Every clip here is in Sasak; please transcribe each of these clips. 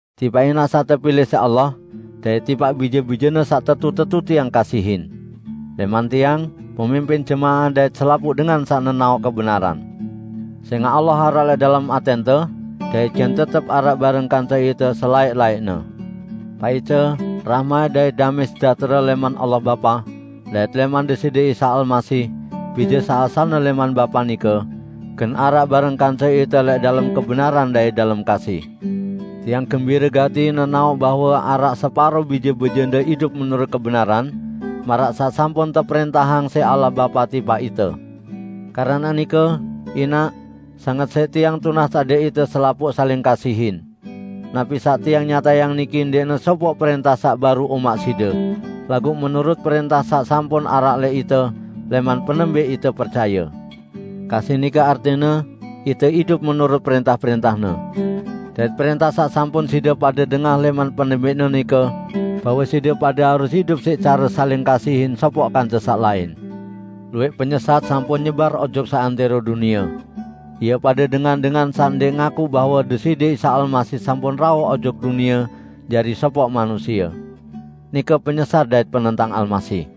Tipaq Inaq saq tepilẽq siq Allah, dait tipaq bije-bijene saq tetu-tetu tiang kasihin. Lẽman tiang, pemimpin jemaah dait selapuq dengan saq nenaoq kebenaran. Sẽngaq Allah araq lẽq dalem atẽnte, dait gen tetep araq bareng kance ite selaẽq-laẽqne. Paice, rahmat dait damẽ sejahtere lẽman Allah Bapa, dait lẽman Deside Isa Almasih, Bije saq asalne lẽman Bapa nike, gen araq bareng kance ite lẽq dalem kebenaran dait dalem kasih. Tiang gembire gati nenaoq bahwe araq separo bije-bijende idup menurut kebenaran, maraq saq sampun teprẽntahang siq Allah Bapa tipaq ite. Keranaq nike, Inaq, sanget siq tiang tunas adẽq ite selapuq saling kasihin. Napi saq tiang nyatayang niki ndẽqne sopoq prẽntah saq baru umaq side, laguq menurut prẽntah saq sampun araq lẽq ite lẽman penembẽq ite percaye. Kasih nike artine ite idup menurut prẽntah-prẽntah-Ne. Dait prẽntah saq sampun side pade dengah lẽman penembẽqne nike, bahwe side pade harus idup siq care saling kasihin sopoq kance saq lain. Luwẽq penyesat sampun nyebar ojok seantẽro dunie. Ie pade dengan-dengan saq ndẽq ngakuq bahwe Deside Isa Almasih sampun rauh ojok dunie jari sopoq manusie. Nike penyesat dait penentang Almasih.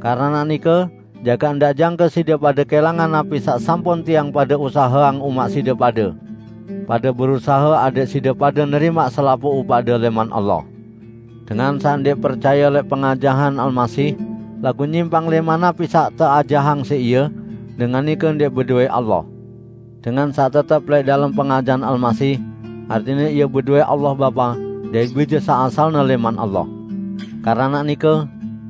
Keranaq nike jagaq ndaq jangke side pade kẽlangan napi saq sampun tiang pade usaheang umaq side pade. Pade berusahe adẽq side pade nerimaq selapuq upaqde lẽman Allah. Dengan saq ndẽq percaye lẽq pengajahan Almasih, laguq nyimpang lẽman napi saq teajahang siq Ie, dengan nike ndẽq bedowẽ Allah. Dengan saq tetep lẽq dalem pengajahan Almasih, artine ie bedowẽ Allah Bapa dait Bije saq asalne lẽman Allah. Keranaq nike,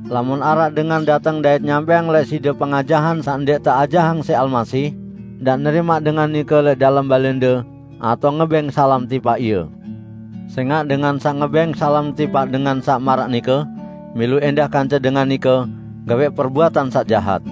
lamun araq dengan dateng dait nyampẽang lẽq side pengajahan saq ndẽq teajahang siq Almasih, ndaq nerimaq dengan nike lẽq dalem balẽnde atao ngebẽng salam tipaq ie. Sẽngaq dengan saq ngebẽng salam tipaq dengan saq maraq nike milu ẽndah kance dengan nike gawẽq perbuatan saq jahat.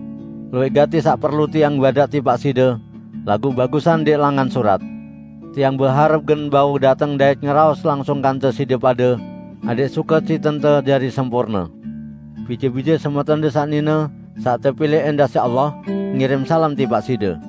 Luwẽq gati saq perlu tiang badaq tipaq side, laguq bagusan ndẽq langan surat. Tiang beharep gen bau dateng dait ngeraos langsung kance side pade, adẽq sukecitente jari sempurne. Bije-bije semetonde saq nine, saq tepilẽq ẽndah siq Allah ngirim salam tipaq side.